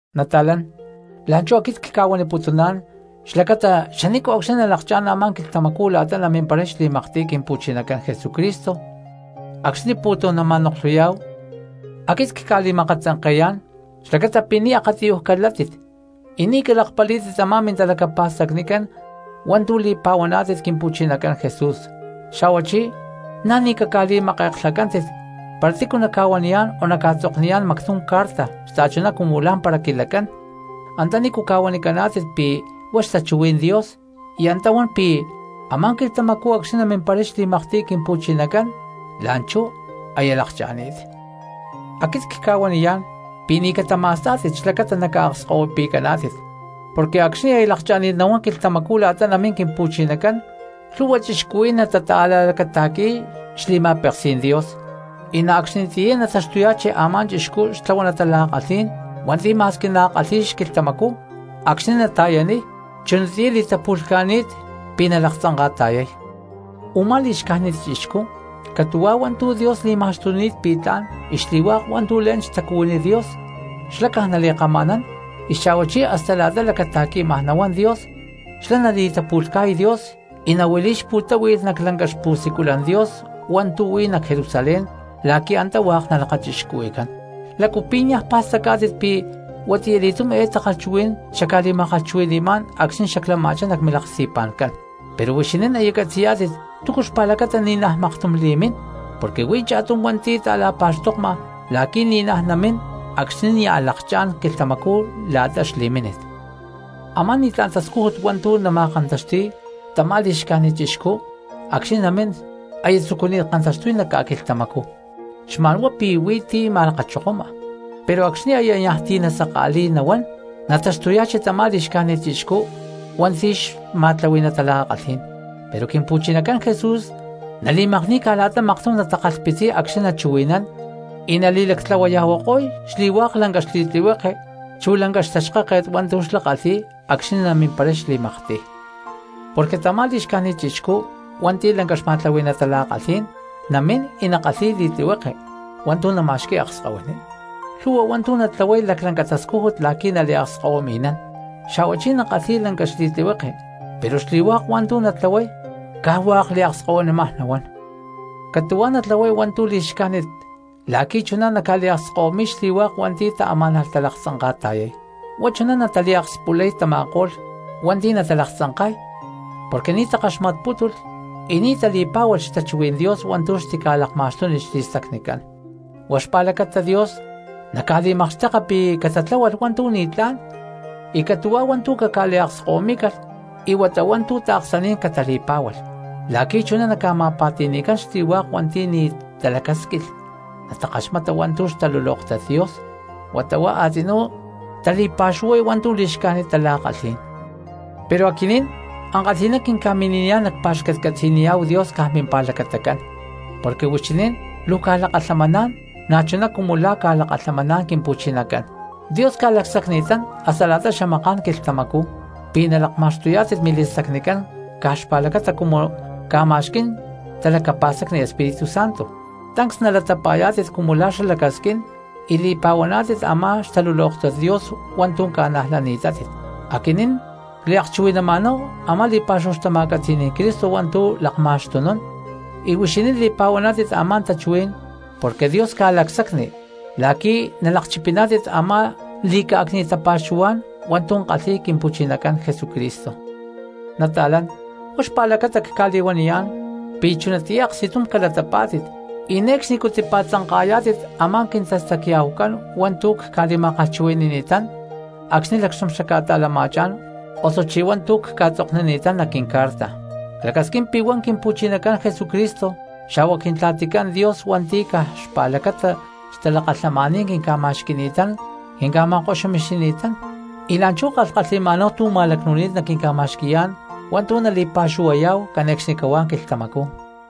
Nata̠lán, la̠nchú aquit cca̠huaniputuná̠n xlacata xani̠nco̠cxni nalakchá̠n a̠má quilhtamacú la̠ta namimparay xli̠maktiy Quimpu̠chinacán Jesucristo acxni̠ pu̠tum nama̠noklhuyá̠hu, aquit cca̠li̠ma̠katzanke̠yán xlacata pi̠ ni̠ akatiyuj calátit y ni̠ calakpalí̠tit tamá mintalacapa̠stacnicán hua̠ntu̠ li̠pa̠huaná̠tit Quimpu̠chinacán Jesús, xa̠huachí na̠ ni̠ caca̠li̠make̠klhacántit para tícu naca̠huaniyá̠n o naca̠tzokniyá̠n mactum carta xta̠chuná cumu lá̠mpara quilacán antanícu ca̠huanicaná̠tit pi̠ huá xtachuhuí̠n Dios y antá huan pi̠ a̠má quilhtamacú acxni̠ namimparay xli̠maktiy Quimpu̠chinacán la̠nchú aya lakcha̠ni̠t. Aquit cca̠huaniyá̠n pi̠ ni̠ catama̠stá̠tit xlacata naca̠akskahuipi̠caná̠tit. Porque acxni̠ aya lakchá̠maj nahuán quilhtamacú la̠ta namín Quimpu̠chinacán lhu̠hua cristianos natata̠la̠lacata̠qui̠y xli̠ma̠peksí̠n Dios, y na̠ acxnitiyá nataxtuyá̠chi a̠má chixcú xtlahuaná tala̠kalhí̠n hua̠nti̠ ma̠squi nakalhi̠y xquilhtamacú acxni̠ nata̠yaniy chunatiyá li̠tapu̠lhca̠ni̠t pi̠ nalaktzanka̠ta̠yay. Umá li̠xcájnit chixcú catu̠huá hua̠ntu̠ Dios li̠ma̠xtuni̠t pi̠ tla̠n y xli̠hua̠k hua̠ntu̠ le̠n xtacuhuiní Dios, xlá caj nali̠kama̠nán; y xa̠huachí hasta la̠ta lacata̠qui̠maj nahuán Dios xlá nali̠tapu̠lhca̠y Dios y nahuili̠y xpu̠táhui̠lh nac lanca xpu̠siculan Dios hua̠ntu̠ huí nac Jerusalén la̠qui̠ antá hua̠k nalakachixcuhui̠cán. ¿Lácu pi̠ niaj pa̠stacá̠tit pi̠ huatiya li̠túm eé takalhchuhuí̠n xacca̠li̠ma̠kalhchuhui̠ni̠má̠n acxni̠ xaclama̠chá nac milaksti̠pa̠ncán? Pero huixinín aya catzi̠yá̠tit túcu xpa̠lacata ni̠naj maktum li̠mín, porque huí cha̠tum hua̠nti̠ ta̠la̠lakapa̠xtokma la̠qui̠ ni̠naj namín acxni̠ nia̠ lakchá̠n quilhtamacú la̠ta xli̠mínit. Amá ni̠tlá̠n tascújut hua̠ntu̠ nama̠kantaxti̠y tamá li̠xcájnit chixcú acxni̠ namín aya tzucuni̠t kantaxtuy nac ca̠quilhtamacú, xma̠nhuá pi̠ huí tu̠ ma̠lakachokoma. Pero acxni̠ aya niaj ti̠ saka̠li̠y nahuán, nataxtuya̠chi tamá li̠xcájnit chixcú hua̠nti̠ xma̠tlahui̠ná tala̠kalhí̠n; pero Quimpu̠chinacán Jesús nali̠makni̠y caj la̠ta maktum natakalhpitziy acxni̠ nachuhui̠nán y nali̠lactlahuaya̠huako̠y xli̠hua̠k lanca xli̠tlihueke chu lanca xtaxkáket hua̠ntu̠ xlá kalhi̠y acxni̠ namimparay xli̠maktiy. Porque tamá li̠xcájnit chixcú hua̠nti̠ lanca xma̠tlahui̠ná tala̠kalhí̠n namín y nakalhi̠y li̠tlihueke hua̠ntu̠ nama̠xqui̠y akskahuiní; lhu̠hua hua̠ntu̠ natlahuay hua̠ntu̠ laclanca tascújut la̠qui̠ naliakskahuimi̠nán. Xa̠huachí nakalhi̠y lanca xli̠tlihueke, pero xli̠hua̠k hua̠ntu̠ natlahuay caj hua̠k liakskahuinímaj nahuán. Catu̠huá natlahuay hua̠ntu̠ li̠xcájnit la̠qui̠ chuná naca̠liakskahuimi̠y xli̠hua̠k hua̠nti̠ taamá̠nalh talaktzanka̠ta̠yay. Huá chuná nataliakspulay tama̠ko̠lh hua̠nti̠ natalaktzanka̠y porque ni̠ takaxmatpútulh y ni̠ tali̠pá̠hualh xtachuhuí̠n Dios hua̠ntu̠ xtica̠lakma̠xtúnilh xli̠stacnicán. Huá xpa̠lacata Dios naca̠li̠makxteka pi̠ catatláhualh hua̠ntu̠ ni̠tlá̠n y catu̠huá hua̠ntu̠ caca̠li̠akskahuimí̠calh y huata hua̠ntu̠ taaksaní̠n catali̠pá̠hualh. La̠qui̠ chuná naca̠ma̠pa̠ti̠ni̠cán xli̠hua̠k hua̠nti̠ ni̠ talacásquilh natakaxmata hua̠ntu̠ xtalulóktat Dios, huata huá a̠tzinú tali̠pa̠xuhuay hua̠ntu̠ li̠xcájnit tala̠kalhí̠n. Pero aquinín ankalhi̠ná quinca̠mini̠niyá̠n nacpa̠xcatcatzi̠niyá̠hu Dios caj mimpa̠lacatacán, porque huixinín luu cca̠lakalhamaná̠n na̠chuná cumu la̠ ca̠lakalhamaná̠n Quimpu̠chinacán; Dios ca̠lacsacni̠tán hasta la̠ta xamaká̠n quilhtamacú pi̠ nalakma̠xtuyá̠tit mili̠stacnicán caj xpa̠lacata cumu ca̠ma̠xquí̠n talacapa̠stacni Espíritu Santo tancs nalatapa̠yá̠tit cumu la̠ xlá lacasquín y li̠pa̠huaná̠tit a̠má xtalulóktat Dios hua̠ntu̠ ca̠najlani̠tátit. Aquinín cliakchuhui̠naná̠hu a̠má li̠pa̠xúhu xtama̠catzi̠ní̠n Cristo hua̠ntu̠ lakma̠xtunún y huixinín li̠pa̠huántit a̠má tachuhuí̠n porque Dios ca̠lacsacni la̠qui̠ na̠ nalakchipiná̠tit a̠má li̠cá̠cni̠t xtapa̠xuhuá̠n hua̠ntu̠ kalhi̠y Quimpu̠chinacán Jesucristo. Nata̠lán, huá xpa̠lacata cca̠li̠huaniyá̠n pi̠ chunatiyá aksti̠tum calatapá̠tit y ne̠cxnicú tipa̠tzanka̠yá̠tit a̠má quintastacya̠hucán hua̠ntu̠ cca̠li̠ma̠kalhchuhui̠ni̠ni̠tán acxni̠ lacxtum xacca̠ta̠lama̠chá̠n osuchí hua̠ntu̠ cca̠tzoknini̠tán nac quincarta. Clacasquín pi̠ huá Quimpu̠chinacán Jesucristo xa̠hua Quintla̠ticán Dios hua̠nti̠ caj xpa̠lacata xtalakalhamaní̠n quinca̠pa̠xqui̠ni̠tán quinca̠ma̠koxumixini̠tán y la̠nchú kalhkalhi̠ma̠náhu tu̠ ma̠lacnu̠ni̠t naquinca̠ma̠xqui̠yá̠n hua̠ntu̠ nali̠pa̠xuhuayá̠hu cane̠cxnicahuá quilhtamacú,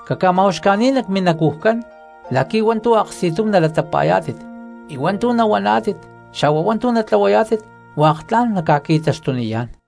caca̠ma̠uxca̠ní̠n nac minacujcán la̠qui̠ hua̠ntu̠ aksti̠tum nalatapa̠yá̠tit y hua̠ntu̠ nahuaná̠tit xa̠hua hua̠ntu̠ natlahuayá̠tit hua̠k tla̠n naca̠qui̠taxtuniyá̠n.